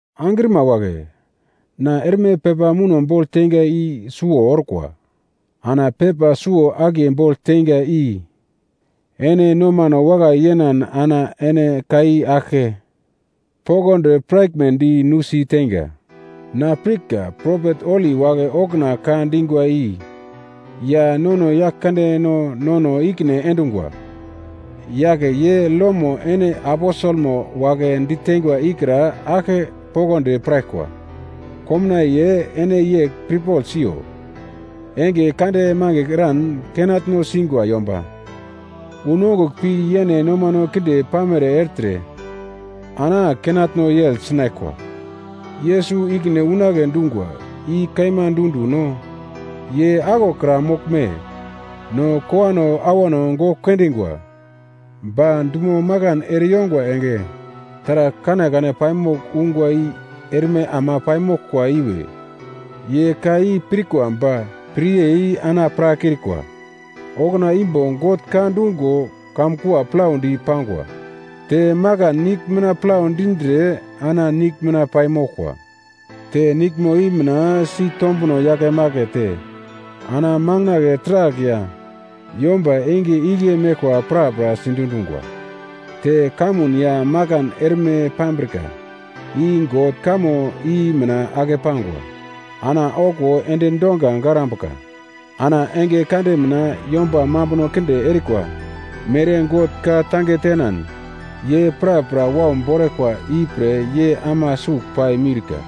Angrima wagle! Na erme pepa muno bogl teinga i suwo orkwa. Ana pepa suwo-akiye bogl teinga i ene nomano wakai yenan ana ene ka i aglke poglodi piraglmedi nusi teinga. Na pirka propet holi wagle okuna ka dingwa i ya nono Yaglkandeno nono i-ikine endungwa yagl ye lomo ene aposelno wagle ditengwa ikra aglke poglodi piraglkwa. Komnaiye ene yegl pirpogl siyo. Enge kande magl eran kenatno singwa yomba unongugl pi yene nomano kinde pamere ertre ana kenatno yegl sinaglkwa, “Yesus ikine unagle dungwa, i kaima dundu-no? Ye aglokra moglme? No kowano awano gogl kendingwa, ba dumo makan ereyongwa enge taragl kanekane paimogl ungwa i erme ama paimoglkwa iwe.” Ye ka i pirkwa ba piryei ana pirakrikwa. Okuna imbo God ka dungo, kamkua plaudi pangwa. Te makan nigl mina plau dindre ana nigl mina paimoglkwa. Te niglmo i mina sitombuno yakemakete ana makandle taragl ya yomba enge igle meglkwa prapra sidundungwa. Te kamun ya makan erme pambrika i God kamo i mina ake pangwa, ana okuwo endi donga garambuka. Ana enge kande mina yomba mambuno kinde erikwa mere God ka-tange tenan ye prapra wau boraglkwa ipre ye ama suglpai miurka.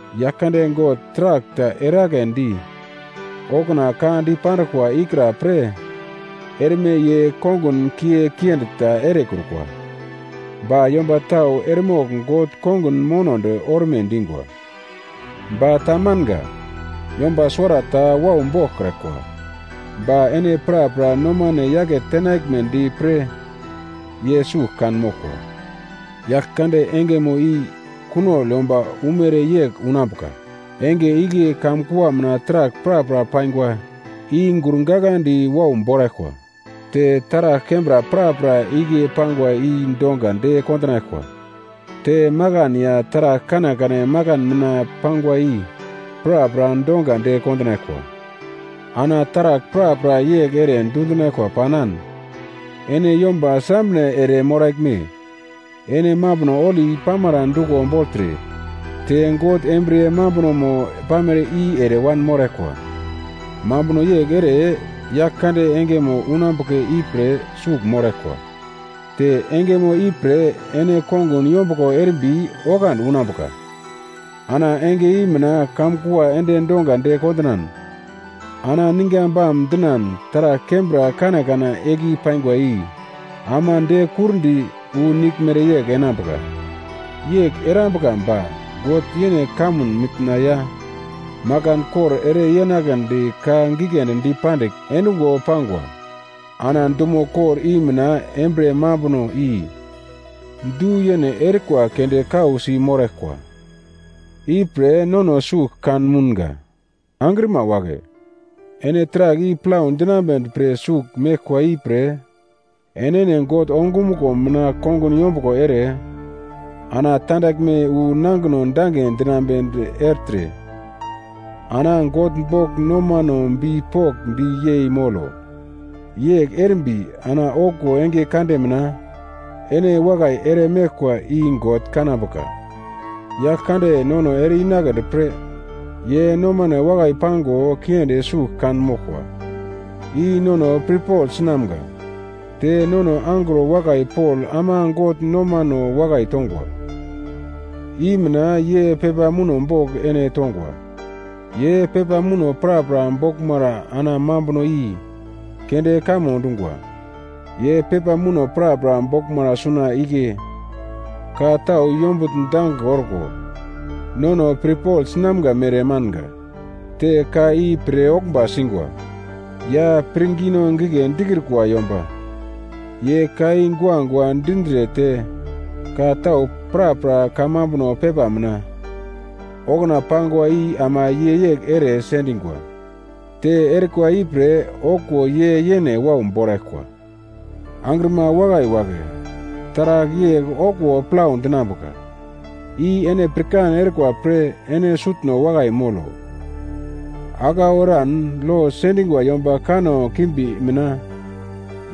Yaglkande God taragl ta eragledi okuna ka dipanduglkwa ikra pre erme ye kongun kiye kiendi ta erekrukwa, ba yomba tau eremogl God kongun monodi orme dingwa. Ba tamanga. Yomba suwarata wau boglkraglkwa, ba ene prapra nomano yake tenaglmedi pre, ye sugl kan moglkwa. Yaglkande engemo i kunogl yomba umere yegl unambuka. Enge igle kamkua mina taragl prapra paingwa i gurgagladi wau boraglkwa. Te taragl kembra prapra igle pangwa i donga de kondinaglkwa. Te makan ya taragl kanekane makan mina pangwa i prapra donga de kondinaglkwa. Ana taragl prapra yegl ere dundinaglkwa panan ene yomba srambre ere moraglme? Ene mambuno holi pamara duglo bogltre te God embriye mambunomo pamere i ere wanmoraglkwa. Mambuno yegl ere Yaglkande engemo unambuka ipre sugl moraglkwa, te engemo ipre ene kongun yombuglo erimbi oglandi unambuka. Ana enge i mina kamkua endi donga de kondinan, ana ninga bam dinan taragl kembra kanekane igle pangwa i ama de-kurdi wu nigl mereyegl enambuka. Yegl erambuka ba God yene kamun mitna ya makan kor ere yenaglendi ka giglendi dipandigl endungo pangwa. Ana dumo kor i mina embriye mambuno i du-yene erikwa keunde kausi moraglkwa, ipre nono sugl kan mounga. Angrima wagle, ene taragl i plau dinambedi pre sugl meglkwa ipre enene God ongumuglo mina kongun yombuglo ere ana tandaglme wu nangino dange dinambedi ertre ana God bogl nomano bipokndi yei molo. Yegl erimbi ana okuwo enge kande mina ene wakai ere meglkwa i God kanambuka. Yaglkande nono ere-inagledi pre ye nomano wakai pango kiendi sugl kan moglkwa, i nono pirpogl sinamga. Te nono angro wakai Pol ama God nomano wakai tongwa i mina ye pepa muno bogl ene tongwa. Ye pepa muno prapra boglmara ana mambuno i keunde kamo dungwa. Ye pepa muno prapra boglmara suna igle ka tau yombugl dange orko nono pirpogl sinamga mere manga. Te ka i pir-oglmba singwa, ya pirngino gigle dikrukwa yomba ye ka i guagua dindre te ka tau prapra kamambuno pepa mina okuna pangwa i ama ye yegl ere sendingwa. Te erikwa ipre okuwo ye yene wau boraglkwa. Angrima wakai wagle, taragl yegl okuwo plau dinambuka i ene pirkan erikwa pre ene sutno wakai molo. Aglau eran lo sendingwa yomba kanno kimbi mina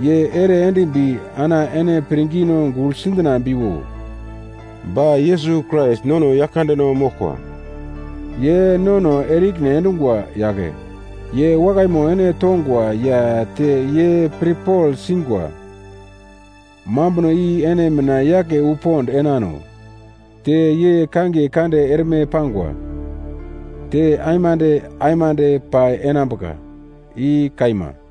ye ere endimbi ana ene pirngino gugl sidinambiwo. Ba Yesus Krais nono Yaglkandeno moglkwa. Ye nono ere-ikine endungwa yagle. Ye wakaimo ene tongwa ya te ye pre pirpogl singwa mambuno i ene mina yake wu pond enano. Te ye kangiye kande erme pangwa, te aimande aimande pai enambuka. I kaima.